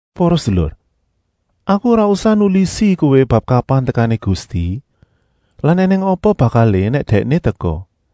Para sedulur, aku ora usah nulisi kowé bab kapan tekané Gusti lan ènèng apa bakalé nèk Dèkné teka.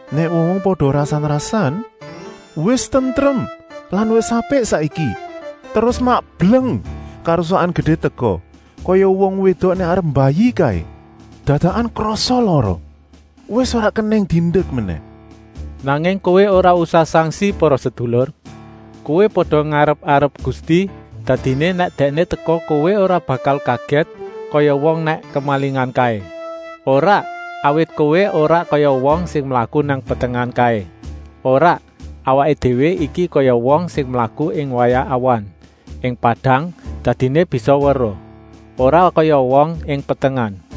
Nèk wong-wong pada rasan-rasan: “Wis tentrem lan wis apik saiki,” terus mak bleng, karusakan gedé teka, kaya wong wédok nèk arep mbayi kaé, dadakan krasa lara. Wis ora kenèng diendek menèh. Nanging kowé ora usah sangsi, para sedulur. Kowé pada ngarep-arep Gusti, dadiné nèk Dèkné teka kowé ora bakal kagèt kaya wong nèk kemalingan kaé. Ora, awit kowé ora kaya wong sing mlaku nang petengan kaé. Ora, awaké déwé iki kaya wong sing mlaku ing wayah awan, ing padang, dadiné bisa weruh. Ora kaya wong ing petengan.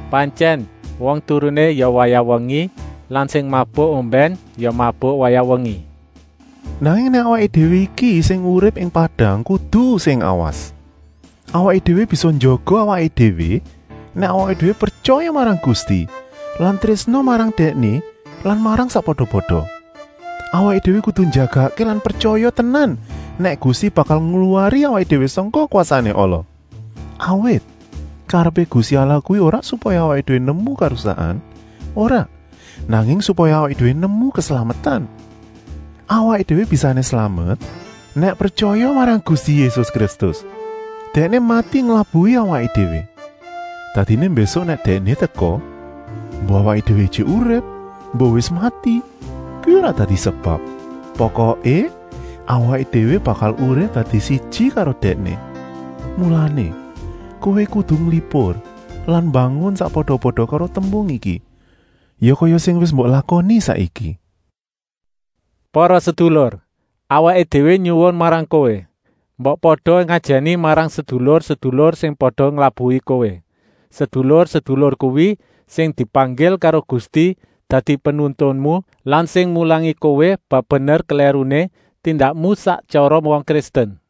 Pantyèn, wong turuné ya wayah wengi lan sing mabuk ombèn ya mabuk wayah wengi. Nanging awaké déwé iki sing urip ing padang kudu sing awas. Awaké déwé bisa njaga awaké déwé nèk awaké déwé pretyaya marang Gusti lan trésna marang Dèkné lan marang sakpada-pada. Awaké déwé kudu njagakké lan pretyaya tenan nèk Gusti bakal ngluwari awaké déwé sangka kwasané ala. Awit, karepé Gusti Allah kuwi ora supaya awaké déwé nemu karusakan, ora, nanging supaya awaké déwé nemu keslametan. Awaké déwé bisané slamet, nèk pretyaya marang Gusti Yésus Kristus. Dèkné mati nglabuhi awaké déwé. Dadiné mbésuk nèk Dèkné teka, embuh awaké déwé ijik urip, embuh wis mati, kuwi ora dadi sebab. Pokoké, awaké déwé bakal urip dadi siji karo Dèkné. Mulané, kowé kudu nglipur lan mbangun sakpada-pada karo tembung iki. Ya kaya sing wis mbok lakoni saiki. Para sedulur, awaké déwé nyuwun marang kowé: mbok pada ngajèni marang sedulur-sedulur sing pada nglabuhi kowé. Sedulur-sedulur kuwi sing dipanggil karo Gusti dadi penuntunmu lan sing mulangi kowé bab bener-klèruné tindakmu sak tyara wong Kristen.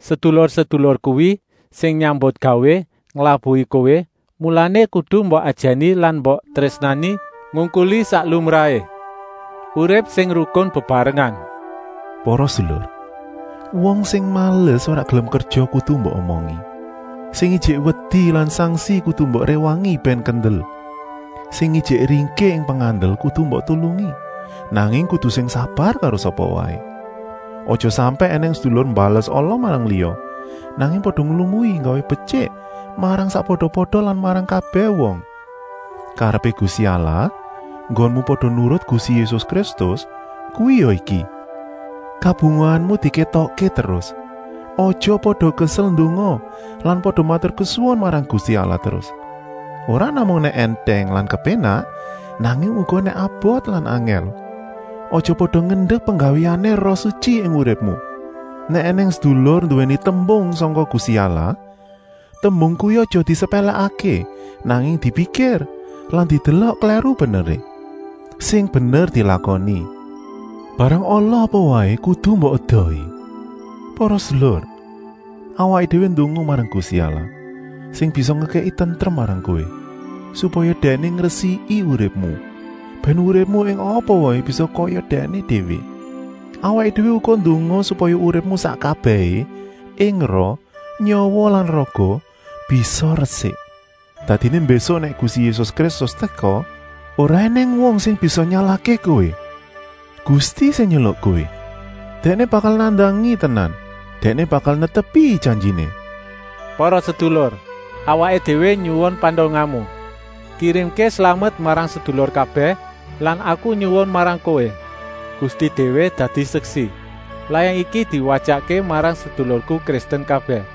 Sedulur-sedulur kuwi sing nyambutgawé nglabuhi kowé, mulané kudu mbok ajèni lan mbok trésnani ngungkuli sak lumrahé. Urip sing rukun bebarengan. Para sedulur, wong sing males ora gelem kerja kudu mbok omongi. Sing ijik wedi lan sangsi kudu mbok réwangi bèn kendel. Sing ijik ringkih ing pengandel kudu mbok tulungi, nanging kudu sing sabar karo sapa waé. Aja sampèk ènèng sedulur mbales ala marang liya, nanging pada nglumui nggawé betyik marang sakpada-pada lan marang kabèh wong. Karepé Gusti Allah enggonmu pada nurut Gusti Yésus Kristus kuwi ya iki: kabungahanmu dikétokké terus, aja pada kesel ndonga lan pada maturkesuwun marang Gusti Allah terus, ora namung nèk èntèng lan kepénak, nanging uga nèk abot lan angèl. Aja pada ngendek penggawéané Roh Sutyi ing uripmu. Nèk ènèng sedulur nduwèni tembung sangka Gusti Allah, tembung kuwi aja disepèlèkké, nanging dipikir lan didelok klèru-beneré. Sing bener dilakoni. Barang ala apa waé kudu mbok edohi. Para sedulur, awaké déwé ndonga marang Gusti Allah, sing bisa ngekèki tentrem marang kowé, supaya Dèkné ngresiki uripmu, bèn uripmu ing apa waé bisa kaya Dèkné déwé. Awaké déwé uga ndonga supaya uripmu sak kabèhé, ing roh, nyawa lan raga, bisa resik. Dadiné mbésuk nèk Gusti Yésus Kristus teka, ora ènèng wong sing bisa nyalahké kowé. Gusti sing nyeluk kowé, Dèkné bakal nandangi tenan. Dèkné bakal netepi janjiné. Para sedulur, awaké déwé nyuwun pandongamu. Kirimké slamet marang sedulur kabèh lan aku nyuwun marang kowé, Gusti déwé dadi seksi, layang iki diwatyakké marang sedulurku Kristen kabèh.